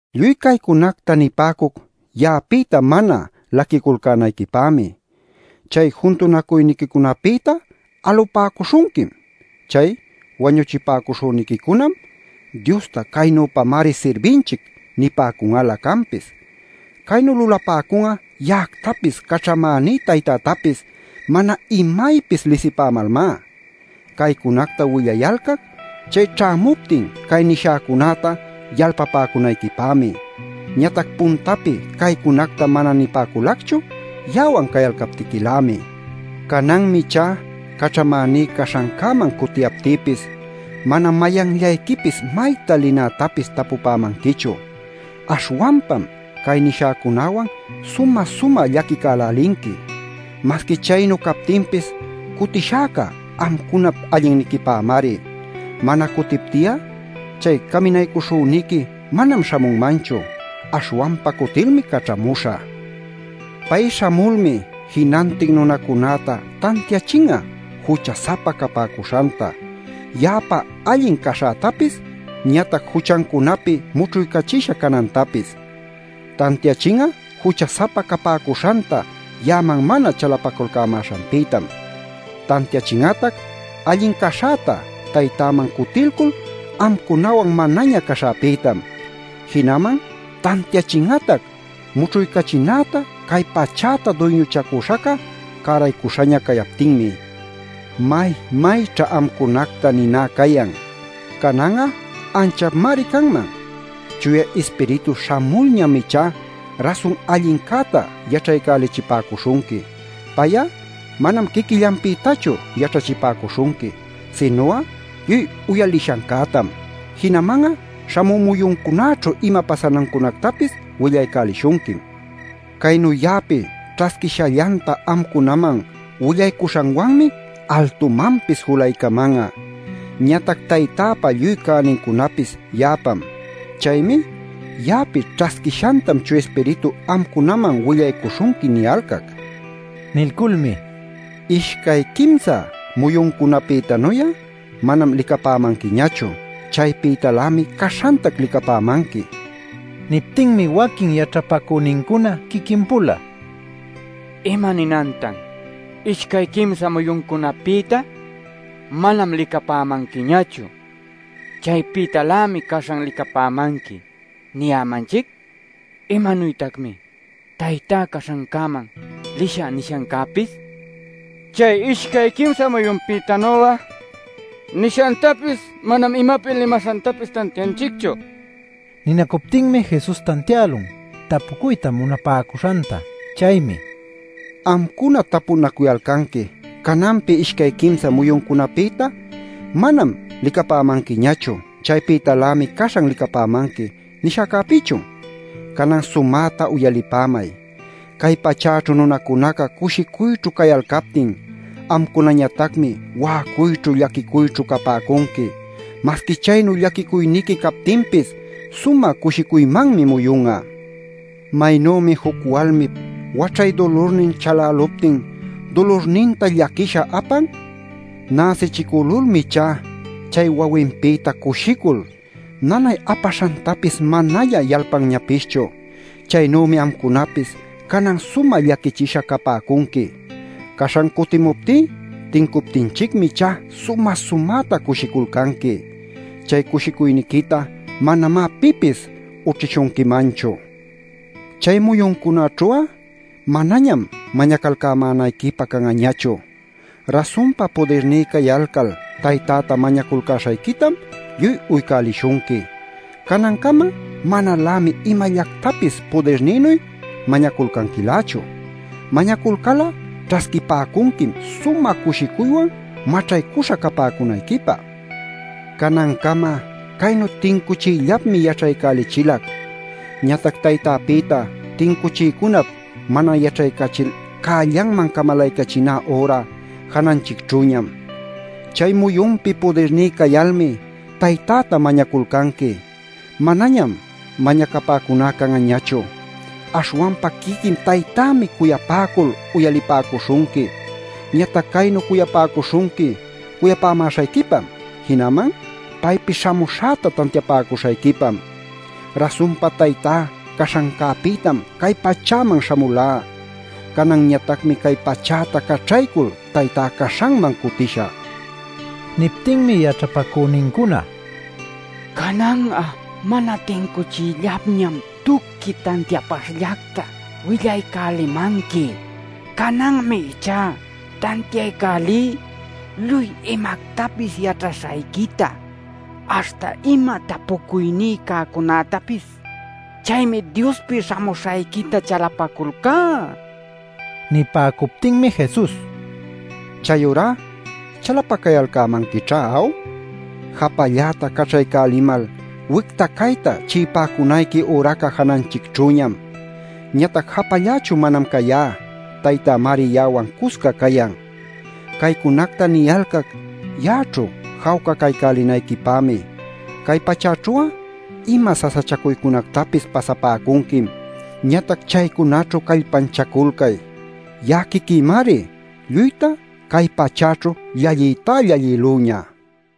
“Lluy caycunacta nipäcuc ya'apïta mana laquiculcänayquipämi. Chay juntunacuynincunapïta alupäcuśhunquim. Chay wañuchipäcuśhüniquicunam: ‘Diosta caynüpamari sirbinchic’ nipäcun'alä canpis. Caynu lulapäcun'a ya'actapis caćhamäní Taytätapis mana imaypis lisipämalmá. Caycunacta willayalcac chay ćhämuptin cay nishäcunäta yalpapäcunayquipämi. Ñatac puntapi caycunacta mana nipäculacchu ya'awan cayalcaptiquilämi. Cananmi ichá caćhamäní caśhancäman cutiyaptïpis mana mayanllayquipis mayta linätapis tapupämanquichu. Aśhwanpam cay nishäcunäwan sumä-sumä llaquicälälinqui. Masqui chaynu captinpis, cutishäca amcunap allinniquipämari. Mana cutipti'a chay Caminaycuśhüniqui manam śhamunmanchu. Aśhwanpa cutilmi caćhamuśhä. Pay śhamulmi jinantin nunacunäta tantiachin'a jucha-sapa capäcuśhanta, ya'apa allin caśhätapis, ñatac juchancunapi mućhuycachisha canantapis. Tantiachin'a jucha-sapa capäcuśhanta ya'aman mana chalapaculcämäśhanpïtam. Tantiachin'atac allin caśhäta Taytäman cutilcul amcunawan manaña caśhäpïtam. Jinaman tantiachin'atac mućhuycachinäta cay pachäta duyñuchacüśhaca cäraycuśhaña cayaptinmi. “May-mayćha amcunacta niná cayan. Canan'a anchapmari canman. Chuya Ispiritu śhamulñam ichá rasun allincäta yaćhaycälichipäcuśhunqui. Pay'a manam quiquillanpïtachu yaćhachipäcuśhunqui, sinu'a lluy uyalishancätam. Jinaman'a śhamü muyuncunäćhu ima pasanancunactapis willaycälishunquim. Caynu ya'api ćhasquishallanta amcunaman willaycuśhanwanmi altumanpis julaycaman'a. Ñatac Taytäpa lluy cänincunapis ya'apam. Chaymi ‘Ya'api ćhasquishantam Chuya Ispiritu amcunaman willaycuśhunqui’ niyalcac” nin. Nilculmi: “Ishcay quimsa muyuncunapïtanuy'a manam licapämanquiñachu. Chaypïtalämi caśhantac licapämanqui” nin. Niptinmi waquin yaćhapacünincuna quiquin-pula: “¿Imaninantan ‘Ishcay quimsa muyuncunapïta manam licapämanquiñachu. Chaypïtalämi caśhan licapämanqui’ niyämanchic? ¿Imanuytacmi ‘Taytá caśhanman lishä’ nishancäpis? Chay ‘Ishcay quimsa muyunpïtanu'a’ nishantapis manam imapi limaśhantapis tantianchicchu” ninaculcäla. Ninacuptinmi Jesus tantiälun tapucuyta munapäcuśhanta. Chaymi: “¿Amcuna tapunacuyalcanqui ‘Cananpi ishcay quimsa muyuncunapïta manam licapämanquiñachu. Chaypïtalämi caśhan licapamanqui’ nishäcäpïchun? Canan sumäta uyalipämay: cay pachäćhu nunacunaca cushicuyćhu cayalcaptin amcunañatacmi wa'acuyćhu llaquicuyćhu capäcunqui. Masqui chaynu llaquicuyniqui captinpis sumä cushicuymanmi muyun'a. Maynümi juc walmip waćhay dulurnin chaläluptin dulurninta llaquisha apan. Näsichicülulmi ichá chay wawinpïta cushicul nanay apaśhantapis manaña yalpanñapischu. Chaynümi amcunapis canan sumä llaquichisha capäcunqui. Caśhan cutimuptí tincuptinchicmi ichá sumä-sumäta cushiculcanqui. Chay cushicuyniquitá manamá pipis ućhishunquimanchu. Chay muyuncunaćhu'a, manañam mañacalcämänayquipä can'añachu. Rasunpa pudirní cayalcal Taytäta mañaculcäśhayquitam lluy uycälishunqui. Canancama manalämi imallactapis pudirnïnuy mañaculcanquilächu. Mañaculcal'a ćhasquipäcunquim sumä cushicuywan maćhaycuśha capäcunayquipä. “Canancama caynu tincuchiyllapmi yaćhaycälichilac. Ñatac Taytäpïta tincuchiycunap mana yaćhaycachil cällanman camalaycachiná üra jananchicćhüñam. Chay muyunpi pudirní cayalmi Taytäta mañaculcanqui. Manañam mañacapuná can'añachu. Aśhwanpa quiquin Taytämi cuyapäcul uyalipäcuśhunqui. Ñatac caynu cuyapäcuśhunqui cuyapämäśhayquipam, jinaman paypi śhamuśhäta tantiapäcuśhayquipam. Rasunpa Taytá caśhancäpïtam cay pachäman śhamulá. Cananñatacmi cay pachäta caćhaycul Taytá caśhanman cutishä” nin. Niptinmi yaćhapacünincuna: “Canan'a mana tincuchillalñam tuqui tantiapaśhllacta willaycälimanqui. Cananmi ichá tantiaycälí lluy imactapis yaćhaśhayquita aśhta ima tapucuyní cäcunactapis. Chaymi Diospi śhamuśhayquita chalapaculcá” nipäcun. Nipäcuptinmi Jesus: “Chayurá chalapacayalcämanquićhá ¿aw? Japalläta caćhaycälälimal wicta cayta chi'ipäcunayqui üraca jananchicćhüñam. Ñatac japallächu manam cayá; Taytämari ya'awan cusca cayan. “Caycunacta niyalcac ya'aćhu jawca caycälinayquipämi. Cay pachäćhu'a ima sasachacuycunactapis pasapäcunquim. Ñatac chaycunaćhu callpanchaculcay; ya'a quiquïmari lluyta cay pachäćhu llalliytá llallïlüña” nin.